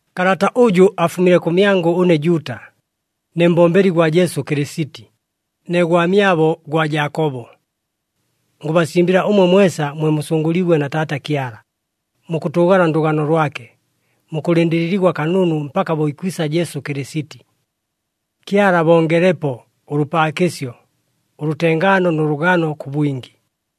Kalata ʉjʉ afumile kʉmyangʉ ʉne Juuta, ne mbombeli gwa Jesu Kɨlɨsiti, ne gwamyabo gwa Jaakobo. Ngʉbasimbɨla ʉmwe mwesa mwe musʉngʉliigwe na Taata Kyala, mukʉtʉʉgala ndʉgano lwake, mukʉlɨndɨlɨligwa kanunu mpaka bo ikwisa Jesu Kɨlɨsiti. Kyala abongelepo ʉlʉpaakɨsyo, ʉlʉtengaano nʉ lʉgano kʉ bwingi.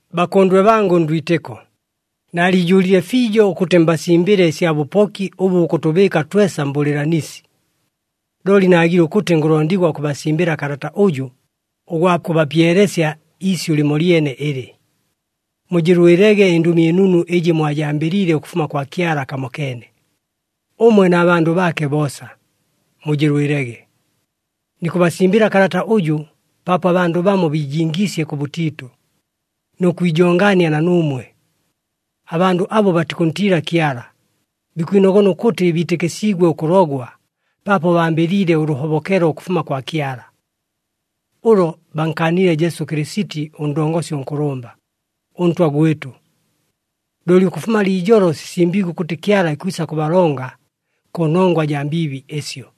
Bakʉndwe bangʉ ndwitɨko, naaliijʉʉlile fiijo ʉkʉtɨ mbasimbɨle ɨsya bʉpoki ʉbʉ bukʉtʉbɨɨka twesa mbʉlɨɨlanisi. Looli naagile ʉkʉtɨ ngʉlondigwa ʉkʉbasimbɨla kalata ʉjʉ, ʉgwa kʉbapyelesya iisyʉ lɨmolyene ɨlɨ. Mujɨlwɨlege ɨNdʉmi ɨNunu ɨjɨ mwajambɨliile ʉkʉfuma kwa Kyala kamokeene, ʉmwe na bandʉ baake boosa! Mujɨlwɨlege! Nikʉbasimbɨla kalata ʉjʉ paapo abandʉ bamo biijingiisye kʉbʉtiitʉ, nʉ kwijongaania na nuumwe. Abandʉ abo batikʉntiila Kyala, bikwinogona ʉkʉtɨ biitɨkɨsiigwe ʉkʉlogwa paapo bambɨliile ʉlʉhobokelo ʉkʉfuma kwa Kyala. Ʉlo bankaanile Jesu Kɨlɨsiti ʉNdongosi ʉNkʉlʉmba, ʉNtwa gwɨtʉ. Looli ʉkʉfuma liijolo sisimbiigwe ʉkʉtɨ Kyala ikwisa kʉbalonga kʉnongwa jaa mbiibi ɨsyo.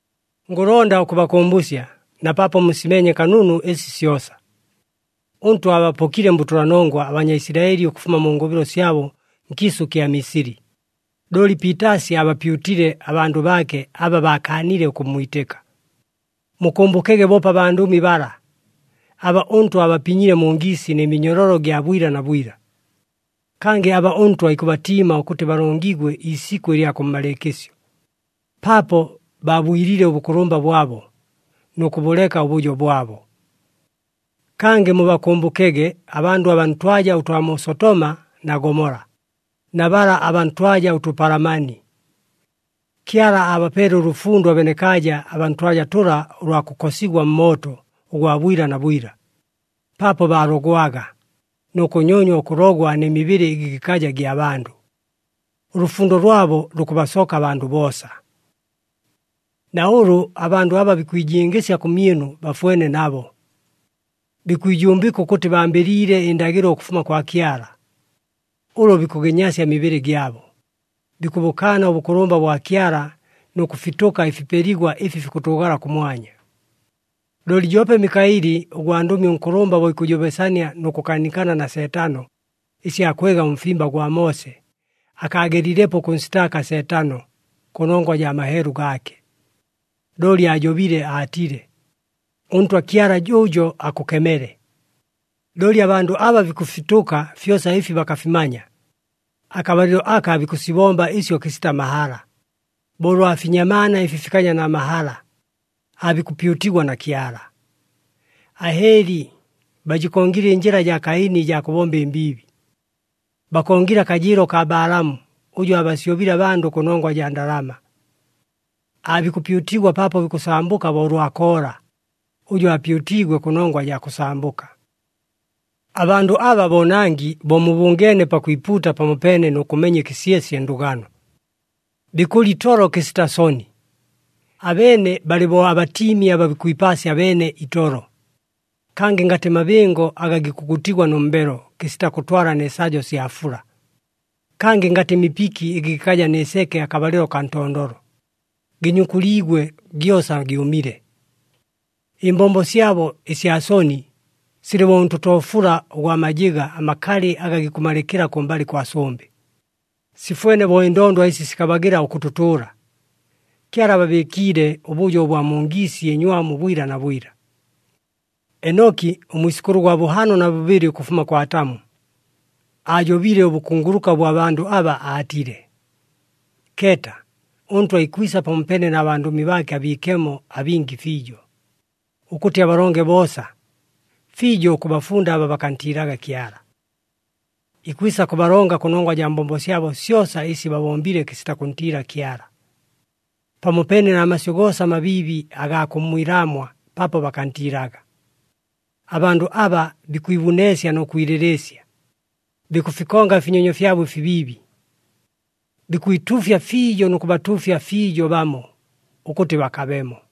Ngʉlonda ʉkʉbakʉmbʉsya, na paapo musimeenye kanunu ɨsi syosa. ɄNtwa aabapokile mbʉtʉlanongwa aBanyaisilaɨli ʉkʉfuma mu ngʉbɨlo syabo nkiisʉ kya Misili, looli piitaasi aabapyutile abandʉ baake aba baakaanile ʉkʉmmwitɨka. Mukʉmbʉkege boope abandʉmi bala, aba ʉNtwa abapinyile mu ngiisi nɨ minyololo gya bwila na bwila. Kangɨ aba ʉNtwa ikʉbatiima ʉkʉtɨ balongigwe iisikʉ ɨlya kʉmmalɨɨkɨsyo, paapo baabwilile ʉbʉkʉlʉmba bwabo, nʉ kʉbʉleka ʉbʉjo bwabo. Kangɨ mubakʉmbʉkege abandʉ abaa ntwaja ʉtwa mu Sotoma na Gomola, na bala abaa ntwaja ʉtʉpalamani. Kyala aabapeele ʉlʉfundo abenekaaja abaa ntwaja tʉla ʉlwa kʉkosigwa mmooto ʉgwa bwila na bwila, paapo baalogwaga, nʉ kʉnyonywa ʉkʉlogwa nɨ mibɨlɨ ɨgɨ gɨkaja gya bandʉ. Ʉlʉfundo lwabo lukʉbasoka abandʉ boosa. Na ʉlʉ abandʉ aba bikwijingɨsya kʉmyɨnu bafwene nabo. Bikwijumbɨka ʉkʉtɨ bambɨliile ɨndagɨlo ʉkʉfuma kwa Kyala. Ʉlo bikʉgɨnyasya ɨmibɨlɨ gyabo, bikʉbʉkaana ʉbʉkʉlʉmba ʉbwa Kyala nʉ kʉfitʉka ɨfipeligwa ɨfi fikʉtʉʉgala kʉmwanya. Looli joope Mikaɨli ʉgwandʉmi ʉnkʉlʉmba bo ikʉjobesania nʉ kʉkaanikana na Seetano, ɨsya kwega ʉmfimba gwa Moose, akaagelilepo ʉkʉnsitaaka Seetano kʉnongwa jaa maheelu gaake. Looli aajobile aatile, “ɄNtwa Kyala jʉʉjo akʉkemele!” Looli abandʉ aba bikʉfitʉka fyosa ɨfi bakafimanya. Akabalɨlo aka bikʉsibomba ɨsyo kɨsita mahala, bo ʉlwa finyamaana ɨfi fikaja na mahala, aabikʉpyutigwa na Kyala. Ahɨɨli! Bajɨkongile ɨnjɨla jaa Kaini ɨjaa kʉbomba ɨmbiibi. Bakongile akajɨɨlo kaa Balaamu, ʉjʉ aabasyobile abandʉ kʉnongwa jaa ndalama. Aabikʉpyutigwa paapo bikʉsambʉka bo ʉlwa Koola, ʉjʉ aapyutiigwe kʉnongwa jaa kʉsambʉka. Abandʉ aba boonangi bo mubʉngeene pakwipuuta pamopeene nʉ kʉmenya ɨkɨsyesye ndʉgano. Bikʉlya itolo kɨsita soni. Abeene balɨ bo abatiimi aba bikwipaasya beene itolo. Kangɨ ngatɨ mabɨngo aga gikʉgutigwa nʉ mbelo kɨsita kʉtwala nɨ sajo sya fula. Kangɨ ngatɨ mipiki ɨgɨ gɨkaja nɨ seke akabalɨlo kaa ntondolo, gɨnyukuliigwe gyosa gyʉmile. Ɨmbombo syabo ɨsya soni, silɨ bo ʉntotoofula ʉgwa majɨga amakalɨ aga gikʉmalɨkɨla kʉmbalɨ kwa sʉmbɨ. Sifwene bo ɨndondwa ɨsi sikabagɨla ʉkʉtʉtʉʉla. Kyala ababɨɨkiile ʉbʉjo ʉbwa mu ngiisi ɨnywamu bwila na bwila. Enoki, ʉmwisʉkʉlʉ ʉgwa bʉhaano na bʉbɨlɨ ʉkʉfuma kwa Atamu, aajobile ʉbʉkunguluka ʉbwa bandʉ aba, aatile, “Keeta, ʉNtwa ikwisa pamopeene na bandʉmi baake abiikemo abingi fiijo, ʉkʉtɨ abalonge boosa, fiijo ʉkʉbafunda aba bakantiilaga Kyala. Ikwisa kʉbalonga kʉnongwa jaa mbombo syabo syosa ɨsi babombile kɨsita kʉntiila Kyala, pamopeene na masyʉ goosa amabiibi agaa kʉmmwilaamwa paapo bakantiilaga.” Abandʉ aba bikwibuneesya nʉ kwilɨlɨɨsya, bikʉfikonga ɨfinyonyo fyabo ɨfibiibi. Bikwituufya fiijo nʉ kʉbatuufya fiijo bamo, ʉkʉtɨ bakabemo.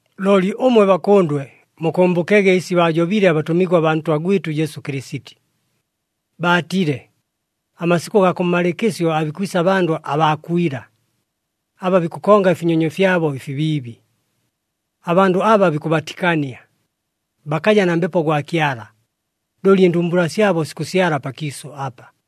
Looli ʉmwe bakʉndwe, mukʉmbʉkege ɨsi baajobile abatʉmigwa baa Ntwa gwɨtʉ Jesu Kɨlɨsiti. Baatile, “Amasikʉ gaa kʉmmalɨɨkɨsyo aabikwisa abandʉ abaa kwila, aba bikʉkonga ɨfinyonyo fyabo ɨfibiibi.” Abandʉ aba bikʉbatikania. Bakaja na Mbepo gwa Kyala, looli ɨndumbula syabo sikʉsyala pakiisʉ apa.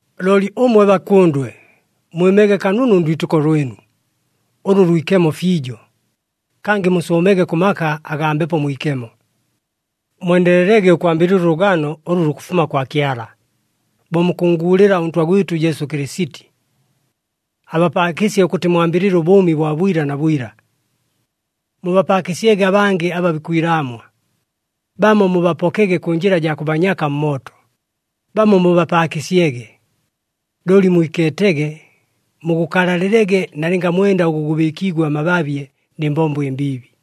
Looli ʉmwe bakʉndwe, mwɨmege kanunu ndwitɨko lwɨnu, ʉlʉ lwikemo fiijo, kangɨ musʉʉmege kʉ maka agaa Mbepo Mwikemo. Mwendelelege ʉkwambɨlɨla ʉlʉgano ʉlʉ lukʉfuma kwa Kyala, bo mukʉnnguulɨla ʉNtwa gwɨtʉ Jesu Kɨlɨsiti. Abapaakɨsye ʉkʉtɨ mwambɨlɨle ʉbʉʉmi bwa bwila na bwila. Mubapaakɨsyege abangɨ aba bikwilaamwa, bamo mubapokege kʉ njɨla jaa kʉbanyaka mmooto, bamo mubapaakɨsyege. Looli mwikeetege, mugʉkalalɨlege nalɨnga mwenda ʉgʉ gʉbɨɨkiigwe amababye nɨ mbombo ɨmbiibi.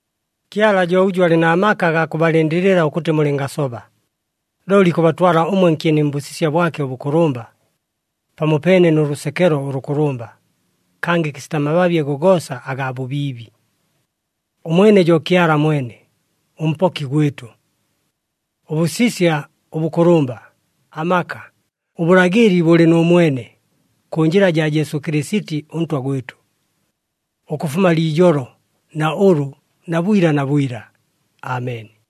Kyala jo ʉjʉ alɨ na maka agaa kʉbalɨndɨlɨla ʉkʉtɨ mulɨngasoba, looli ikʉbatwala ʉmwe nkyeni mbʉsisya bwake ʉbʉkʉlʉmba, pamopeene nʉ lʉsekelo ʉlʉkʉlʉmba, kangɨ kɨsita mababye gogoosa agaa bʉbiibi. Ʉmwene jo Kyala mwene, ʉMpoki gwɨtʉ. Ʉbʉsisya, ʉbʉkʉlʉmba, amaka, ʉbʉlagɨli bʉlɨ nʉ mwene, kʉ njɨla jaa Jesu Kɨlɨsiti ʉNtwa gwɨtʉ, ʉkʉfuma liijolo, na ʉlʉ, na bwila na bwila. Ameni.